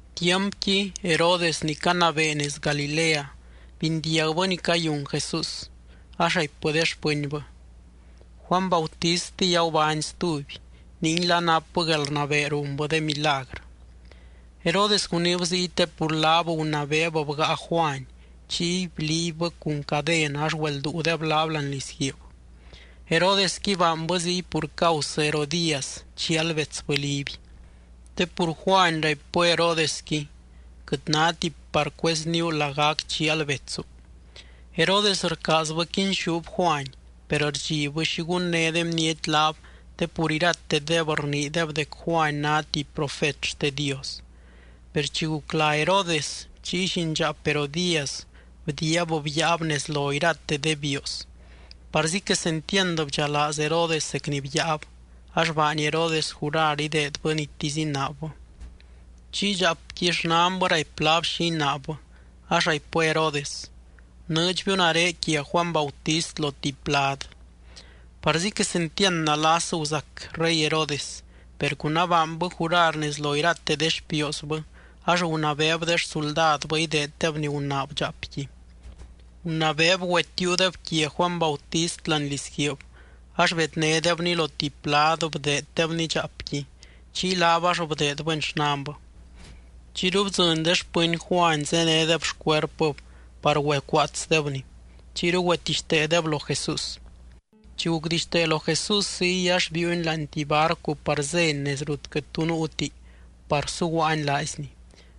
Tiampqui Herodes ni canabee nez Galilea, bindiagbɨ ni cayun Jesús. Ax raipbɨ de xpɨnbɨ: —Juany Bautistiy agubány stuby. Ninguila napbɨ guelrnabee runbɨ de milagrɨ. Herodes guniib ziy te pur laab gunabeeb bgáa Juany, chiy bliibbɨ cun caden ax güelduudeb laab láani lizguiib. Herodesqui baanbɨ ziy pur causɨ Herodías chial betsbɨ Liby, te pur Juany raipbɨ Herodesqui: —Quɨt náti par cuezníu lagac chial betsu. Herodes rcaazbɨ quinxúb Juany, per rdxibbɨ xi gunné de bniety laab te pur iratedeb rniideb dec Juany ná tuby profet xte Dios. Per chi guc lá Herodes, chiy llindxaap Herodías bdiiab byaab nez lo irate de bioos. Parzi quesentiand bdxalaaz Herodes zec ni byaab ax baany Herodes jurar ideedbɨ nitisy inaabbɨ. Chiy dxaapqui xnanbɨ raipy laab xi inaabbɨ, ax raipbɨ Herodes: —Bnɨɨdxbiu nare quia Juany Bautist lo tuby plad. Parzi quesentiand nalas guzac rey Herodes. Per cun abaanbɨ jurar nez lo irate de xpioosbɨ, ax gunabeeb de xsuldadbɨ ideeddeb ni gunaab dxaapqui. Gunabeeb güetiiudeb quia Juany Bautist láani lizguiib, ax bednédebni lo tuby plad bdeeddebni dxaapqui, chiy laab ax bdeedbɨni xnanbɨ. Chiyru bdzɨny de xpɨny Juany zénedeb xcuerpɨb par güecuaatsdebni. Chiyru güetixteedeb lo Jesús. Chi gucdixtee lo Jesús ziy, ax biiuny láani tuby barcu par zény nez rut quɨt tu nuuti par suguaany laaizny.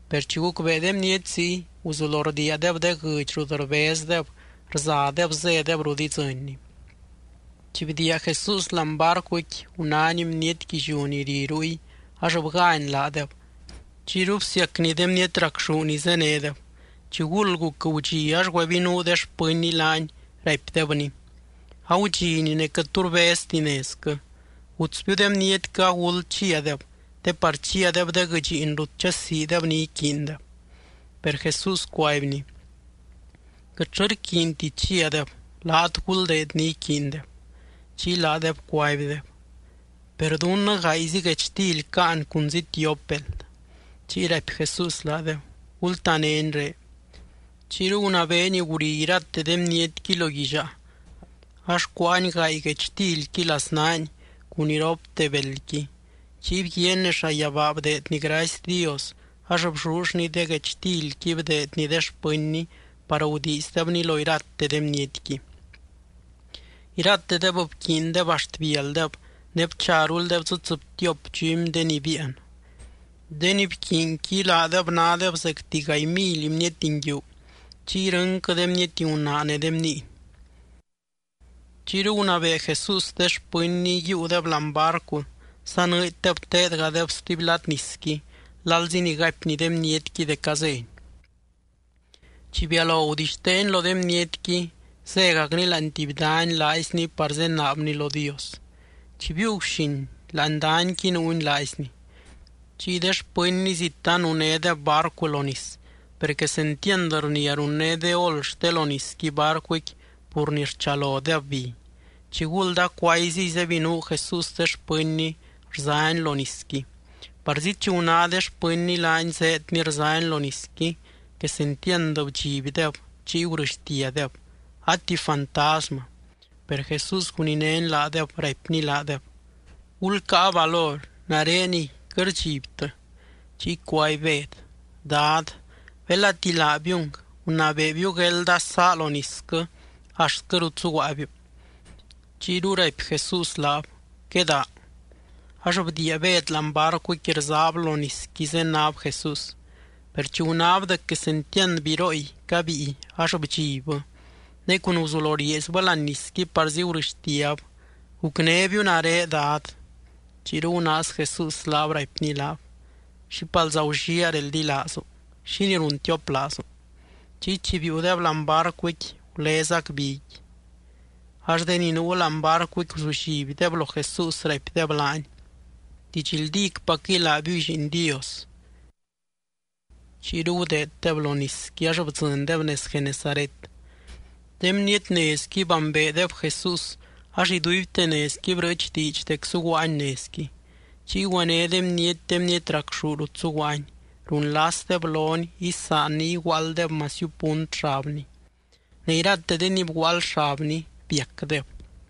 Per chi gucbee de bniety ziy, guzulo rdiiadeb de guɨdx rut rbezdeb rzadeb zédeb rut idzɨnny. Chi bdiia Jesús láani barcuqui, gunány bniety guilliú ni ri ruy ax bgány laadeb chiyru bsiacny de bniety racxú ni zénedeb. Chiguld guc gudxi, ax güebinuu de xpɨnny laany, raipdebny: —Agudxini ne quɨt tu rbezti nezquɨ. Gutsbiu de bnietquɨ aguld chiadeb, te par chiadeb de guɨdxiin rut chasiideb ni iquiindeb. Per Jesús cuaibny: —Quɨtllɨ rquiinti chiadeb. Laat guldeed ni iquiindeb. Chiy laadeb cuaibdeb: —Per dunnɨ gaayzi guechtily caan cunzi tiop beld. Chiy raipy Jesús laadeb: —Gultanéni ré. Chiyru gunabeeny guri irate de bnietqui lo guillaa. Ax cuáany gaay guechtilqui laznaany cun iropte beldqui. Chiy bguiaany nez llayabaa bdeedny gracy Dios ax bllullny de guechtilqui bdeedny de xpɨnny par gudiizdebni lo irate de bnietqui. Iratedeb bquiindeb axt bialdeb, ne bcharuldeb dzɨ tsɨbtiop dxumy de ni biian. De ni bquiinqui laadeb nádeb zecti gaay mily bniety nguiu, chiy irɨnquɨ de bniety gunaa ne de bniiny. Chiyru gunabee Jesús de xpɨnny yiiudeb láani barcu sanɨɨddeb teedgadeb stuby lad nisqui lalzi ni gaipny de bnietqui dec azény. Chi bialo gudixteeny lo de bnietqui, zégacny láani tuby dany laaizny par zenaabny lo Dios. Chi biiu guxin, láani danyqui nuuny laaizny. Chiy de xpɨnny zit anunédeb barcu lo nis, per quesentiand rnia runné de ol xte lo nisqui barcuqui pur ni rchalodeb bi. Chiguld acuayziy zebinuu Jesús de xpɨnny rzany lo nisqui. Parzi chi guná de xpɨnny laany zéedny rzany lo nisqui, quesentiand bdxibdeb chiy gurɨxtiadeb: —¡A tuby fantasmɨ! Per Jesús guninény laadeb, raipny laadeb: —¡Gulcáa valor! ¡Nareniy, quɨt rdxibtɨ! Chiy cuaby Bed: —Dad, belati laabiung, gunabeebiu guelda sá lo nisquɨ axtquɨ rut zuguaabiu. Chiyru raipy Jesús laab: —Quedaa. Ax bdiia Bed láani barcuqui, rzab lo nisqui zenáb Jesús. Per chi gunáb dec quesentiand birooy cabíi ax bdxibbɨ, ne cun guzulo rieezbɨ láani nisqui parzi gurɨxtiab: —¡Gucnébiu nare, Dad! Chiyru gunaaz Jesús laab, raipny laab: —¡Xípalza gulliaa reldilaazu! ¿Xínii runtioplaazu? Chiy chi biiudeb láani barcuqui, gulezac biqui. Ax de ni nuu láani barcuqui guzullibdeb lo Jesús, raipdeb laany: —Didxldícpacquɨy laabiuy Lliin Dios. Chiyru gudeeddeb lo nisqui ax bdzɨndeb nez Genesaret. De bniety nezqui bambeedeb Jesús ax iduibte nezqui brɨɨch diidx dec zuguaany nezqui. Chiy güené de bniety de bniety racxú rut zuguaany, runlasdeb lony isaanny iguaalddeb masiu punt xabny. Ne irate de ni bguaald xabny biacdeb.